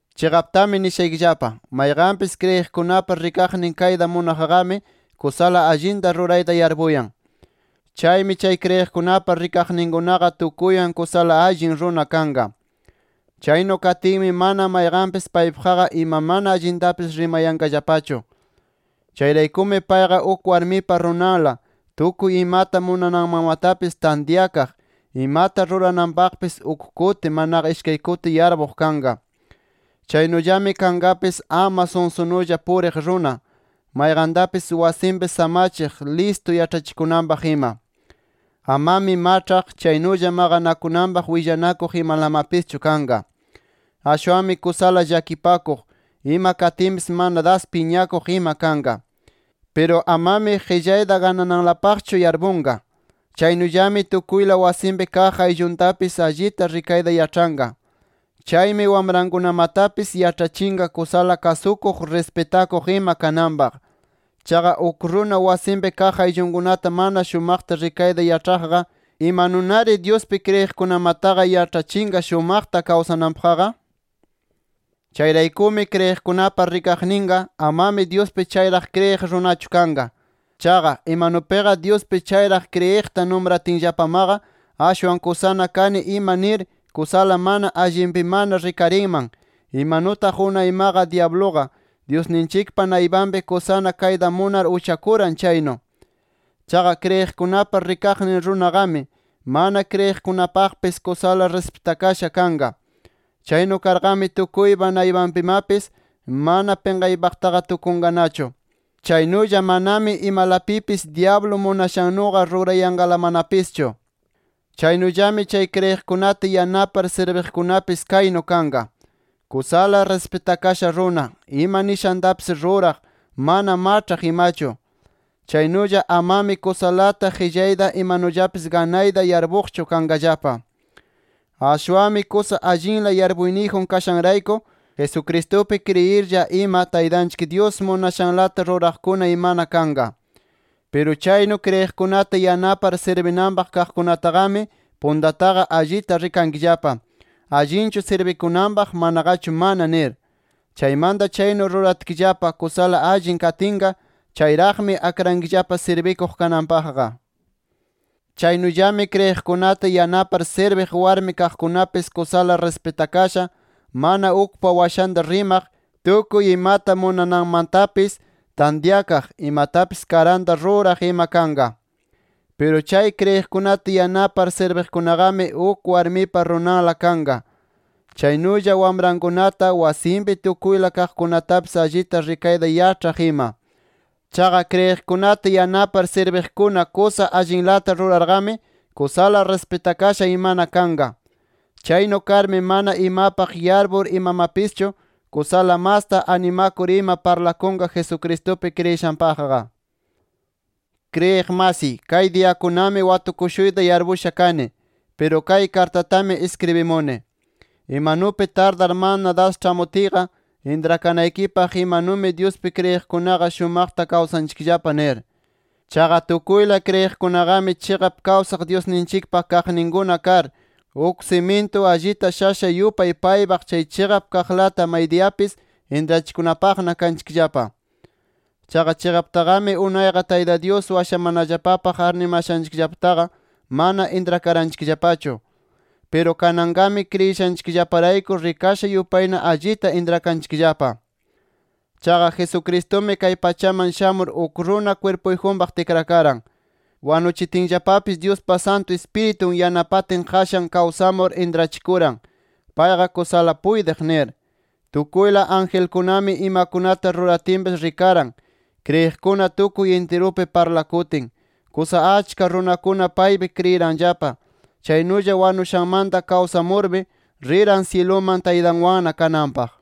Chiqaptami nishaykillapa: Mayqanpis kriyiqkunapa rikaqnin kayta munaqqami, kusala allinta rurayta yarpuyan. Chaymi chay kriyiqkunapa rikaqninkunaqa tukuywan kusala allin runa kanqa. Chaynu katinmi mana mayqanpis paypaqqa ima mana allintapis rimayanqallapachu. Chayraykumi payqa uk warmipa runanla, tukuy imata munananmantapis tantyakaq, imata rurananpaqpis uk kuti, manaqa ishkay kuti yarpuq kanqa. Chaynullami kanqapis ama sunsunulla puriq runa, mayqantapis wasinpi samachiq, listu yaĉhachikunanpaq ima. Amami maĉhaq, chaynulla maqanakunanpaq willanakuq imalamapischu kanqa. Ashwanmi kusala llakipakuq, ima katinpis mana das piñakuq ima kanqa. Piru amami qillayta ganananlapaqchu yarpunqa. Chaynullami tukuyla wasinpi kaq aylluntapis allita rikayta yaĉhanqa. Chaymi wamrankunamatapis yaĉhachinqa kusala kasukuq, rispitakuq ima kananpaq. Chaqa uk runa wasinpi kaq ayllunkunata mana shumaqta rikayta yaĉhaqqa, ¿imanunari Dyuspi kriyiqkunamataqa yaĉhachinqa shumaqta kawsananpaqqa? Chayraykumi kriyiqkunapa rikaqninqa, amami Dyuspi chayraq kriyiq runachu kanqa. Chaqa, imanupiqa Dyuspi chayraq kriyiqta numratinllapamaqa ashwan kusana kani ima nir kusala mana allinpimana rikarinman, imanutaq unaymaqa dyabluqa, Dyusninchikpa naypanpi kusana kayta munar uchakuran chaynu. Chaqa kriyiqkunapa rikaqnin runaqami, mana kriyiqkunapaqpis kusala rispitakasha kanqa. Chaynu karqami tukuypa naypanpimapis mana pinqaypaqtaqa tukunqanachu. Chaynulla manami imalapipis dyablu munashannuqa rurayanqalamanapischu. Chaynullami chay kriyiqkunata yanapar sirbiqkunapis kaynu kanqa: Kusala rispitakasha runa, ima nishantapis ruraq, mana maĉhaq imachu. Chaynulla amami kusalata qillayta imanullapis ganayta yarpuqchu kanqallapa. Ashwanmi, kusa allinla yarpuyniyjun kashanrayku, Jesucristupi kriyirlla ima Taytanchik Dyus munashanlata ruraqkuna imana kanqa. Piru chaynu kriyiqkunata yanapar sirbinanpaq kaqkunataqami, puntataqa allita rikankillapa, allinchu sirbikunanpaq, manaqachu mana nir. Chaymanta chaynu rikatkillapa kusala allin katinqa chayraqmi akrankillapa sirbikuq kananpaqqa. Chaynullami kriyiqkunata yanapar sirbiq warmi kaqkunapis, kusala rispitakasha, mana ukpa washanta rimaq, tukuy imata munananmantapis tantyakaq, imatapis karanta ruraq ima kanqa. Piru chay kriyiqkunata yanapar sirbiqkunaqami uk warmipa runanla kanqa. Chaynulla wamrankunata, wasinpi tukuyla kaqkunatapis allita rikayta yaĉhaq ima. Chaqa kriyiqkunata yanapar sirbiqkuna kusa allinlata rurarqami kusala rispitakasha imana kanqa. Chaynu karmi mana imapaq yarpur imamapischu kusala masta animakur ima parlakunqa Jesucristupi kriyishanpaqqa. Kriyiq masiy, kay diyakunami watukushuyta yarpusha kani. Piru kay kartatami iskribishuni, imanupi tardar mana das ĉhamutiyqa, intrakanaykipaq imanumi Dyuspi kriyiqkunaqa shumaqta kawsanchikllapa nir. Chaqa tukuyla kriyiqkunaqami chiqap kawsaq Dyusninchikpa kaqninkuna kar, uk simintu allita shasha yupay paypaq chay chiqap kaqlata maydiyapis intrachikunapaqna kanchikllapa. Chaqa chiqaptaqami unayqa Tayta Dyus washamanallapapaq arnimashanchikllapataqa mana intrakaranchikllapachu. Piru kananqami kriyishanchikllaparayku rikasha yupayna allita intrakanchikllapa. Chaqa Jesucristumi kay pachaman shamur uk runa kwirpuyjunpaq tikrakaran. Wanuchitinllapapis Dyuspa Santu Ispiritun yanapatin qashan kawsamur intrachikuran, payqa kusala puytiq nir. Tukuyla angelkunami imakunata ruratinpis rikaran. Kriyiqkuna tukuy intirupi parlakutin, kusa achka runakuna paypi kriyiranllapa. Chaynulla wanushanmanta kawsamurmi riran syiluman Taytanwanna kananpaq.